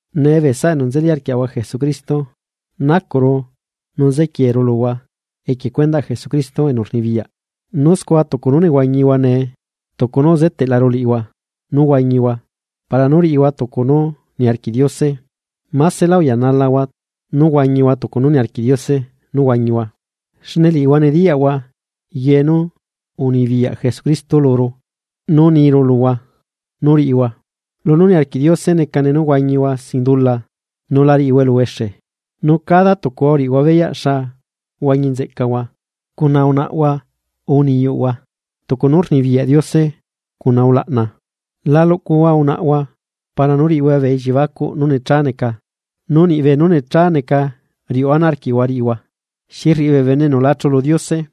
Nee bee saꞌa enu nzeli arquiaꞌahua Jesucristo nacuꞌru nu zequieru luhua equie cuendaꞌ Jesucristo enu rnibiyaꞌ, nu scua tucu nú nehuañihua nee tucu nú uzeteꞌlaru liꞌihua nú huañihua para nú riꞌihua tucu nú niarquiꞌ Diose, másela uyanalahua nú huañihua tucu nú niarquiꞌ Diose nú huañihua. Xne liꞌihua nediyaꞌlaꞌhua ye nú unibiyaꞌ Jesucristo luru nú niru luhua nú riꞌihua. Lunú niarquiꞌ Diose necane nú huañihua sin dula nu la riꞌihua eluhuexe. Nu cada tucuhua uriꞌihua beyaꞌ xa huañi nzeꞌcahua cuna unaꞌahua urre niyuꞌhua tucu nú rnibiyaꞌ Diose cuna ulaꞌna. La luꞌcuhua unaꞌhua para nú riꞌihua bee elliebacuꞌ nú nechá neca, nu niꞌ beenú necha neca riuꞌu ana arquiꞌhua rriꞌihua, xi rriꞌi bee bene enu la chulu Diose.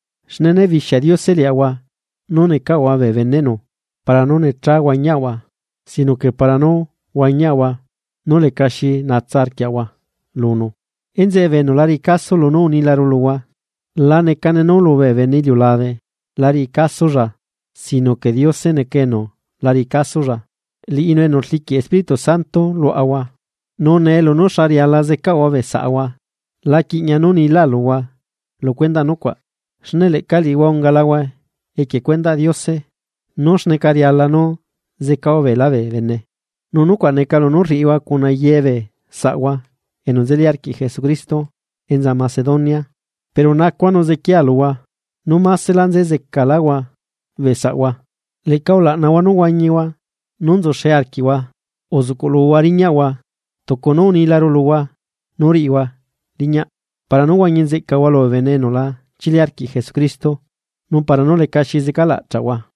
Xne né bixia Diose liaꞌahua nu necaꞌahua bee beneꞌnu para nú nechá huañiaꞌahua, sino que para nú huañiaꞌahua nú leca xi naꞌahua lunu. Enzeꞌe bee enu la riꞌi caso lunú unilaru luhua, la necane nu lu bee bene iliulabe la riꞌi casolla, sino que Diose neca enu la riꞌi casolla. Liꞌinu enu rliquiꞌ Espíritu Santo luaꞌahua. Nu nee lunú xa riala zecahua bee saꞌhua la quiꞌñia nú nilá luhua lu cuendaꞌ nucuaꞌ xne leꞌca liꞌihua ungalahua equie cuendaꞌ Diose nú xneca riala nú zecahua beelá bee bene. Nu nucuaꞌ neca lunú rriꞌihua cuna ye bee saꞌhua enu nzeli arquiꞌ Jesucristo enza Macedonia. Pero nacua nu zequiaa luhua nú másela zecaláhua bee saꞌahua. Leꞌca ulaꞌnahua nú huañihua nú nzuxe arquiꞌhua, uzuꞌcuꞌluhua riñaꞌhua, tucu nú unilaru luhua nú riꞌihua riñaꞌ, Para nú huañi nzeꞌcahua lu bee bene enu la chili arquiꞌ Jesucristo nu para nú leca xi zecalaꞌchaꞌhua.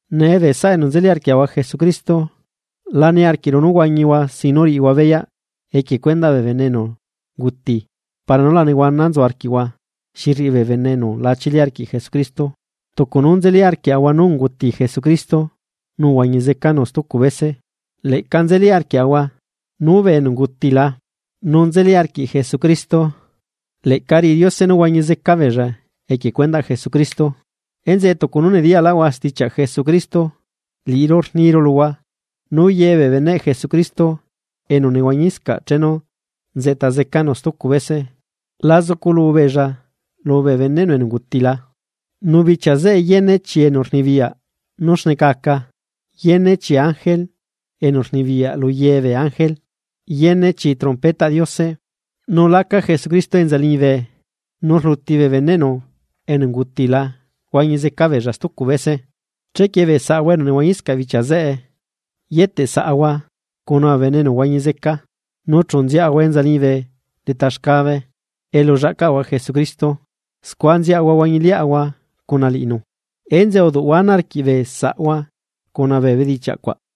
Nee bee saꞌa enu nzeli arquiaꞌahua Jesucristo, la niarquiꞌru nú huañihua sin nú riꞌihua beyaꞌ equie cuendaꞌ bee bene enu unguti para nú la nehuana nzu arquiꞌhua xi rriꞌi bee bene enu la chili arquiꞌ Jesucristo. Tucu nú nzeli arquiaꞌahua nú unguti Jesucristo nu uhuañi zecanu stucu bese, leꞌca nzeli arquiaꞌahua nu bee enu ungutila nu nzeli arquiꞌ Jesucristo, leꞌca riꞌi Diose nú huañi zeca beella equie cuendaꞌ Jesucristo. Enzeꞌe tucu nú nediyaꞌlaꞌahua stichiaꞌ Jesucristo, liꞌiru niru luhua nú ye bee beneꞌ Jesucristo enu nehuañiscaꞌ chenu nzeꞌta zecanu stucu bese, la zuculu beella lu bee beneꞌnu enu ungutila. Nu bichia zeꞌe yene chi enu rnibiyaꞌ nú xneca aca, nu yene chi ángele enu rnibiyaꞌ lu ye bee ángele, yene chi trompetaꞌ Diose. Nu enta Jesucristo enza liñibe nu rluti bee beneꞌnu enu ungutila huañi zeca beella stucu bese. Chequie bee saꞌahua enu nehuañiscaꞌ bichia zeꞌe yeteꞌ saꞌahua cuna bee bene enu huañi zeca, nu chu nziaꞌahua enza liñibe leta xcabe elu llaꞌcaꞌahua Jesucristo scua nziaꞌahua huañiliaꞌahua cuna liꞌinu. Enzeꞌe uduꞌhua ana arquiꞌ bee saꞌhua cuna bee bedichiaꞌ cuaꞌ.